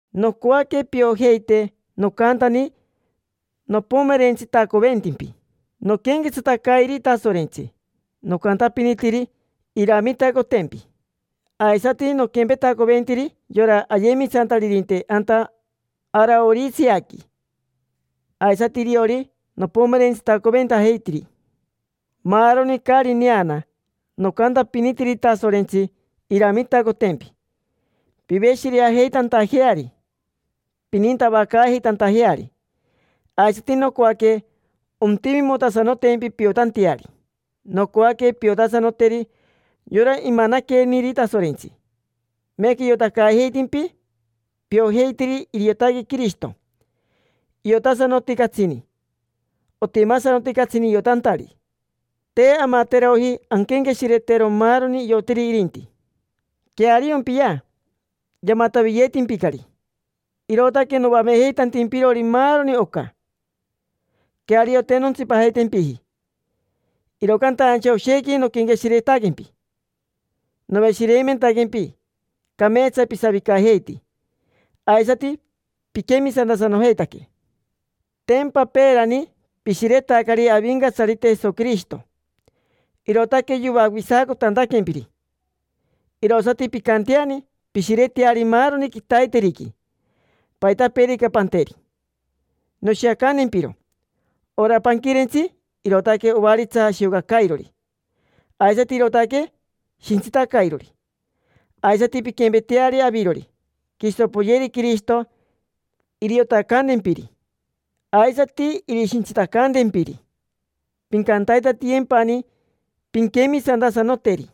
Nocoaque piojeite nocantani nopomerentsitacoventimpi noquenquetsatacairi Tasorentsi: nocantapinitiri iramitacotempi, aisati noquempetacoventiri yora ayemisantaririnte anta Araoriseaqui. Aisati iriori nopomerentsitacoventajeitiri maaroni caari neana. Nocantapinitiri Tasorentsi iramitacotempi piveshireajeitantajeari, pinintavacaajeitantajeari. Aisati nocoaque ontimimotasanotempi piotanteari, nocoaque piotasanoteri yora imanaqueniri Tasorentsi. Meeca iotacaajeitimpi: piojeitiri, iriotaque Quirishito. Iotasanoti catsini, otimasanoti catsini iotantari. Te amateroji anquenqueshiretero maaroni iotiri irinti. Queariompia, yamataviyeetimpicari: irootaque noamejeitantimpirori maaroni oca. Queario, te nontsipajeitempiji, iro cantaincha oshequi noquenqueshiretaquempi. Noveshireimentaquempi: cameetsa pisavicajeiti, aisati piquemisantasanojeitaque. Tempa peerani pishiretacari Avincatsarite Jesoquirishito, irootaque yoavisacotantaquempiri. Irosati pincanteani: pishireteari maaroni quitaiteriqui, paitapeerica panteri. Noshiacantempiro: ora panquirentsi, irootaque ovaritsa shiocacairori, aisati irootaque shintsitacairori. Aisati pinquempeteari avirori, quiso poyeri Quirishito iriotacantempiri, aisati irishintsitacantempiri. Pincantaitatiyempani pinquemisantasanoteri,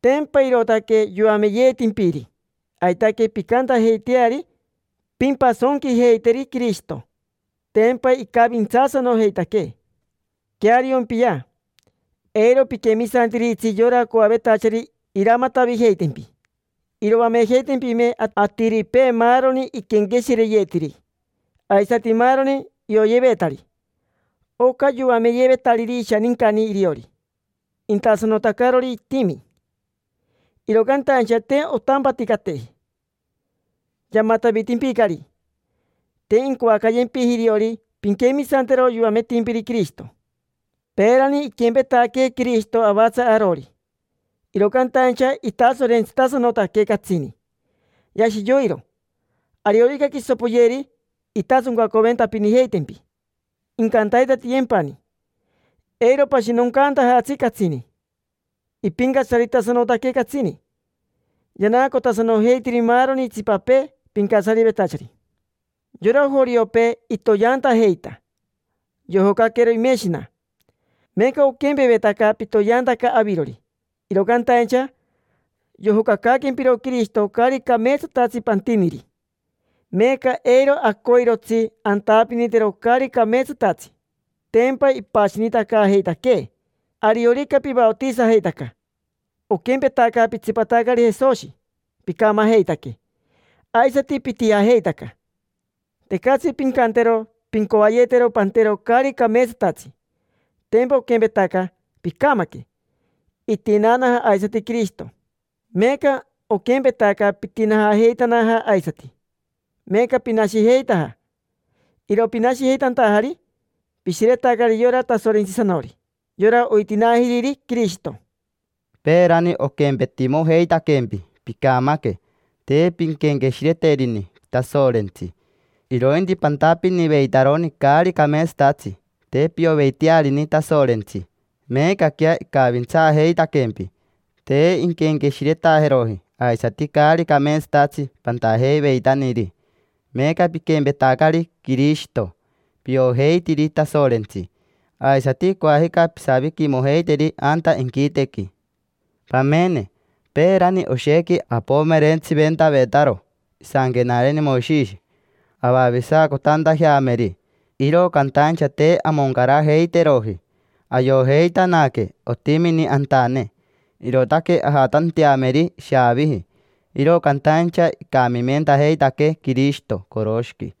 tempa irootaque yoameyeetimpiri. Aitaque pincantajeiteari, pimpasonquijeiteri Quirishito, tempa icavintsaasanojeitaquee. Queariompia: eiro piquemisantiritsi yora coavetachari iramatavijeitempi. Iroamejeitempime atiripee maaroni iquenqueshireyetiri, aisati maaroni ioyevetari: oca yoameyevetariri ishanincani iriori, intasanotacarori itimi, iro cantaincha te ontampaticateji. Yamatavitimpicari. Te incoacayempiji iriori pinquemisantero yoametimpiri Quirishito. Peerani iquempetaquee Quirishito avatsa arori, iro cantaincha itasorentsitasanotaque catsini, yashi yoiro. Ariorica quiso poyeri, intasoncaventapinijeitempi, incantaitatiyempani, eiro pashinoncantajatsi catsini. Ipincatsaritasanotaque catsini, yanaacotasanojeitiri maaroni itsipapee pincatsarivetachari. Yora joriopee, itoyeantajeita: yojocaquero imeshina. Meeca oquempevetaca pitoyeantaca avirori, iro cantaincha yojocacaaquempiro Quirishito caari cameetsatatsi pantiniri. Meeca eiro acoirotsi antapinitero caari cameetsatatsi: tempa ipashinitacaajeitaquee. Ariorica pivaotisajeitaca, oquempetaca pitsipatacari Jesoshi: picamajeitaque, aisati pitijajeitaca. Tecatsi pincantero pincoayetero pantero caari cameetsatatsi: tempa oquempetaca picamaque. Itinaanaja aisati Quirishito, meeca oquempetaca pitinaajeitanaja aisati: meeca pinashijeitaja. Iro pinashijeitantajari, pishiretacari yora Tasorentsisanori: yora oitinaajiriri Quirishito. Peerani oquempetimojeitaquempi picamaque, te pinquenqueshireterini Tasorentsi, irointi pantapiniveitaroni caari cameetsatatsi. Te pioveitearini Tasorentsi. Meecaquea icavintsaajeitaquempi: te inquenqueshiretajeroji aisati caari cameetsatatsi pantajeiveitaniri. Meeca piquempetacari Quirishito: piojeitiri Tasorentsi, aisati coajica pisaviquimojeiteri anta inquitequi. Pamene: peerani oshequi apomerentsiventavetaro isanquenareni Moishishi avavisacotantajeameri, iro cantaincha te amoncarajeiteroji. Ayojeitanaque otimini antane, irootaque ajatanteameri ishaaviji. Iro cantaincha icamimentajeitaquee Quirishito coroshiqui,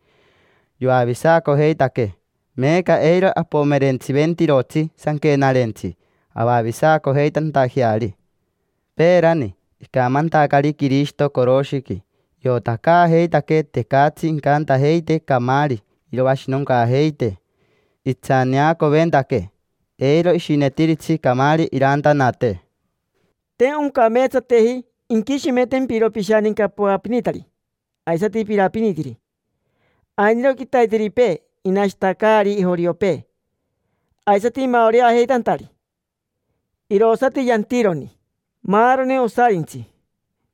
yoavisacojeitaquee. Meeca eiro apomerentsiventirotsi sanquenarentsi avavisacojeitantajeari. Peerani, icamantacari Quirishito coroshiqui, iotacaajeitaquee tecatsi incantajeitee camaari iroashinoncaajeitee. Itsaneacoventaquee, eiro ishinetiritsi camaari irantanatee. Te oncameetsateji inquishimentempiro pishaninca poapinitari aisati piraapinitiri. Ainiro quitaiteripee inashitacaari joriopee, aisati imaoreajeitantari. Irosati yantironi: maaroni osarintsi,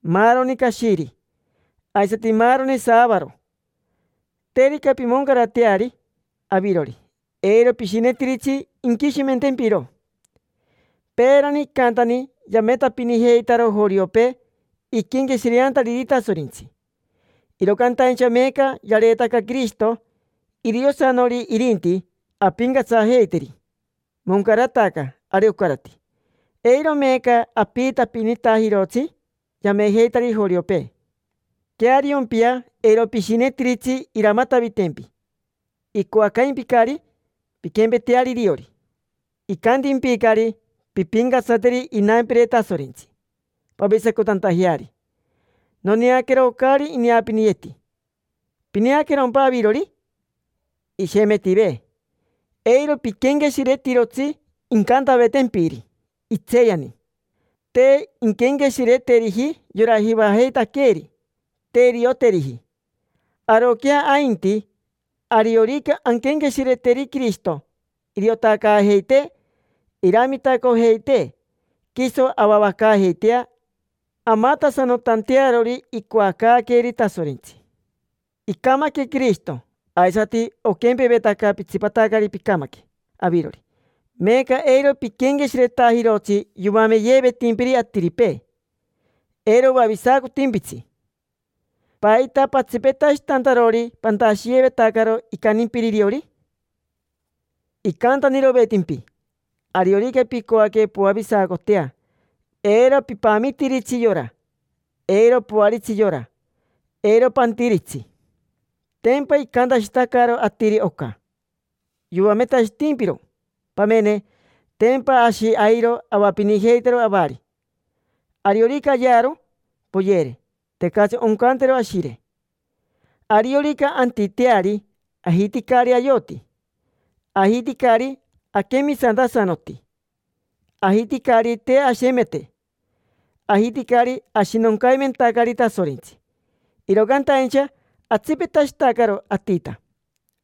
maaroni cashiri, aisati maaroni saavaro. Terica pimoncarateari avirori, eiro pishinetiritsi inquishimentempiro. Peerani icantani yametapinijeitaro joriopee, iquenqueshireantariri Tasorentsi, iro cantaincha meeca yareetaca Quirishito. Iriosanori irinti, ampincatsajeiteri. Moncarataca, ari ocarati: eiro meeca apiitapinitajirotsi yamejeitari joriopee. Queariompia, eiro pishinetiritsi iramatavitempi. Icoacaimpicari pinquempeteari iriori, icantimpicari: “Pimpincatsateri inampire Tasorentsi pavisacotantajeari. Noneaquero caari ineapiniyeeti: ¿pineaquerompa avirori?” Ishemetive. Eiro piquenqueshiretirotsi incantavetempiri, itseeyani. Te inquenqueshireteriji yora Jivajeitaqueeri, te irioteriji. Aroquea ainti, ariorica anquenqueshireteri Quirishito, iriotacaajeitee, iramitacojeitee quiso avavacaajeitea, amatasanotantearori icoacaaqueeri Tasorentsi. Icamaque Quirishito, aisati oquempevetaca pitsipatacari picamaque avirori. Meeca eiro piquenqueshiretajirotsi yoameyevetimpiri atiripee: eiro oavisacotimpitsi. ¿Paita patsipetashitantarori pantashiyevetacaro icantimpiri iriori? Icantanirovetimpi: “Ariorica picoaque poavisacotea, eiro pipamitiritsi yora, eiro poaritsi yora, eiro pantiritsi”. Tempa icantashitacaro atiri oca, yoametashitimpiro. Pamene, tempa ashi airo avapinijeitaro avari: ariorica ayearo, poyere; tecatsi oncantero ashire. Ariorica antiteari, ajiticari ayoti, ajiticari aquemisantasanoti, ajiticari te ashemete, ajiticari ashinoncaimentacari Tasorentsi. Iro cantaincha atsipetashitacaro atita.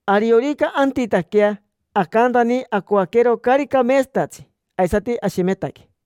Ariorica antitaquea, acantani acoaquero caari cameetsatatsi, aisati ashemetaque.